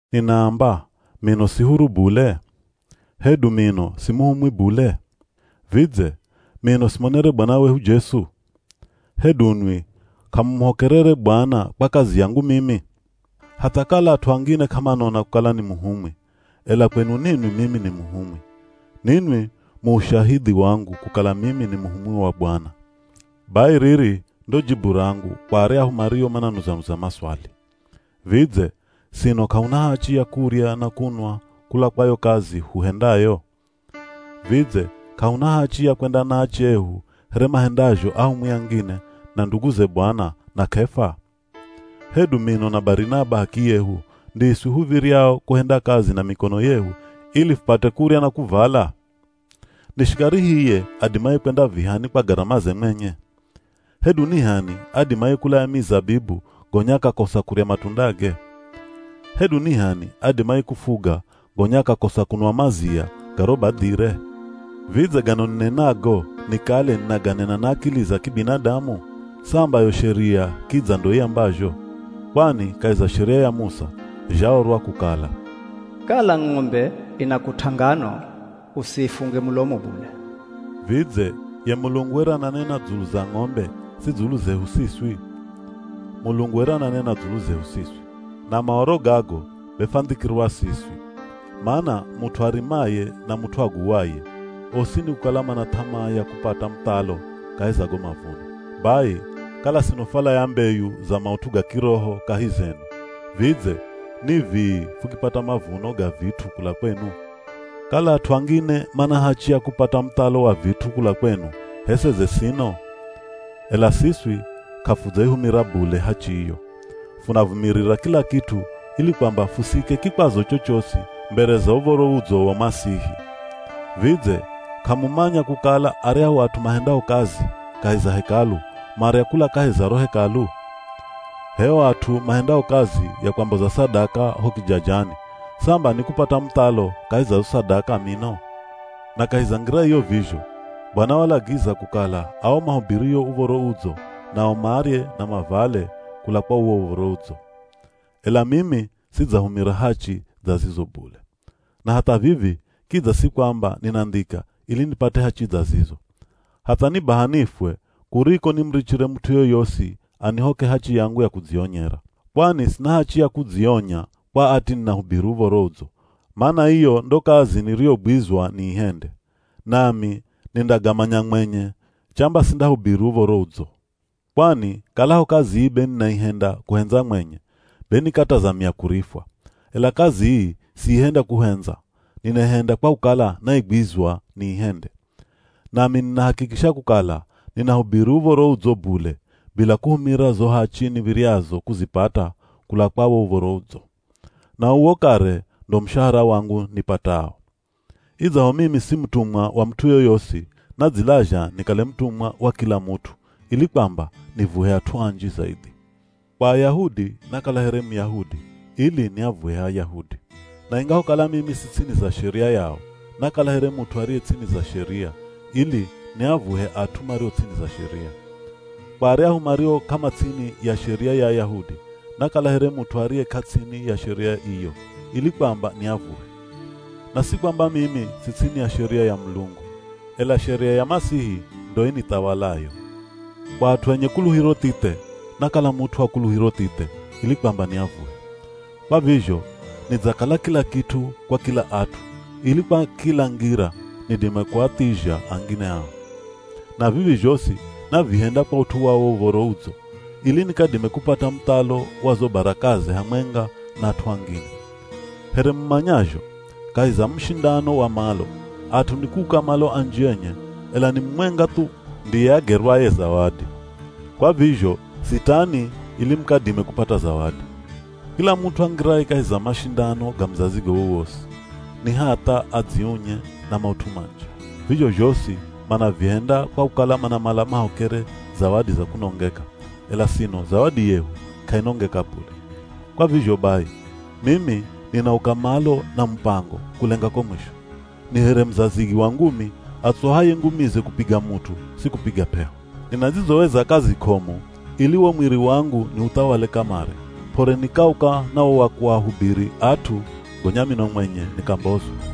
Ninaamba, mino si huru bule? Hedu mino si muhumwi bule? Vidze, mino simonere Bwana wehu Jesu? Hedu nwi k'amumuhokerere Bwana kwa kazi yangu mimi? Hatha kala at'u angine k'amanona kukala ni muhumwi, ela kwenu ninwi mimi ni muhumwi. Ninwi mu ushahidhi wangu kukala mimi ni muhumwi wa Bwana. Bai riri ndo jibu rangu, kwa aryahu mario mananuza-nuza maswali. Vidze, sino k'ahuna hachi ya kurya na kunwa kula kwa yo kazi huhendayo? Vidze k'ahuna hachi ya kwenda na ache ehu here mahendazho ahumwi angine, na nduguze Bwana, na K'efa? Hedu mino na Barinaba h'akiyehu ndiswi huv̱iryao kuhenda kazi na mikono yehu ili fupate kurya na kuvala? Ni shikari hiye adimaye kwenda vihani kwa garamaze mwenye? Hedu ni h'ani adimaye kulaya mizabibu gonya akakosa kurya matundage? Hedu ni h'ani adimaye kufuga gonya akakosa kunwa mazia ga ro badhire? Vidze gano ninenago nikale ninaganena na akili za kibinadamu? Samba yo sheria kidza ndo iambazho! Kwani kahi za Sheria ya Musa, zhaorwa kukala, “Kala ng'ombe inakut'a ngano, usiifunge mulomo bule.” Vidze, ye Mulungu were ananena dzulu za ng'ombe, si dzulu zehu siswi? Mulungu were ananena dzulu zehu siswi. Na Maoro gago be fwandhikirwa siswi. Mana mut'u arimaye na mut'u aguwaye, osi nikukala mana th'amaa ya kupata muthalo kahi za go mavuno. Bai, kala sino fwalaya mbeyu za maut'u ga kiroho kahi zenu, vidze ni vii fukipata mavuno ga vit'u kula kwenu? Kala at'u angine mana hachi ya kupata muthalo wa vit'u kula kwenu, h'e seze sino? Ela siswi k'afudzaihumira bule hachi iyo. Funavumirira kila kit'u ili kwamba fusiike kikwazo chochosi mbere za Uv̱oro Udzo wa Masihi. Vidze, k'amumanya kukala aryahu at'u mahendao kazi kahi za Hekalu marya kula kahi za ro Hekalu? H'e o at'u mahendao kazi ya kwamboza sadaka ho kijajani, samba nikupata muthalo kahi za zo sadaka mino! Na kahi za ngira iyo vizho, Bwana walagiza kukala ao mahubirio Uv̱oro Udzo nao marye na mavale kula kwa uwo Uv̱oro Udzo. Ela mimi sidzahumira hachi dza zizo bule. Na hatha vivi kidza si kwamba ninandhika ili nipate hachi dza zizo. Hatha ni baha nifwe kuriko nimurichire mut'u yoyosi anihoke hachi yangu ya kudzionyera. Kwani sina hachi ya kudzionya kwa ati ninahubiri Uv̱oro Udzo, mana iyo ndo kazi niriyogwizwa niihende. Nami nindagamanya mwenye chamba sindahubiri Uv̱oro Udzo. Kwani kalaho kazi ii be ninaihenda kuhendza mwenye, be nikatazamia kurifwa. Ela kazi ii siihenda kuhendza, ninaihenda kwa kukala naigwizwa niihende. Nami ninahakikisha kukala ninahubiri Uv̱oro Udzo bule, bila kuhumira zo hachi niv̱iryazo kuzipata kula kwa wo Uv̱oro Udzo. Na uwo kare ndo mushahara wangu nipatao. Idzaho mimi si mutumwa wa mut'u yoyosi, nadzilazha nikale mutumwa wa kila mut'u ili kwamba nivuhe at'u anji zaidhi. Kwa Ayahudi nakala here Muyahudi ili niavuhe Ayahudi. Na ingahokala mimi si ts'ini za sheria yao, nakala here mut'u ariye ts'ini za sheria ili niavuhe at'u mario ts'ini za sheria. Kwa aryahu mario k'amats'ini ya sheria ya Ayahudi, nakala here mut'u ariye k'ats'ini ya sheria iyo ili kwamba niavuhe. Na si kwamba mimi si ts'ini ya sheria ya Mulungu, ela sheria ya Masihi ndo inithawalayo. Kwa at'u enye kuluhiro thithe, nakala mut'u wa kuluhiro thithe ili kwamba niavuhe. Kwa vizho nidzakala kila kit'u kwa kila at'u ili kwa kila ngira nidime kuathizha angine ao. Na vivi zhosi navihenda kwa ut'u wa wo Uv̱oro Udzo, ili nikadime kupata muthalo wa zo barakaze hamwenga na at'u angine. Here mumanyazho, kahi za mushindano wa malo, at'u nikuuka malo anji enye ela ni mumwenga thu ndiye agerwaye zawadi. Kwa vizho sitani ili mukadime kupata zawadi. Kila mut'u angiraye kahi za mashindano ga muzazigo wowosi, ni hatha adziunye na maut'u manji. Vizho zhosi manavihenda kwa kukala manamala mahokere zawadi za kunongeka, ela sino zawadi yehu k'ainongeka bule. Kwa vizho bai, mimi ninauka malo na mupango kulenga ko mwisho. Ni here muzazigi wa ngumi atsuhaye ngumize kupiga mut'u, si kupiga p'eho. Ninadzizoweza kazi k'omu ili wo mwiri wangu niuthawale kamare, p'ore nikauka na wo wa kuahubiri at'u gonya mino mwenye nikambozwa.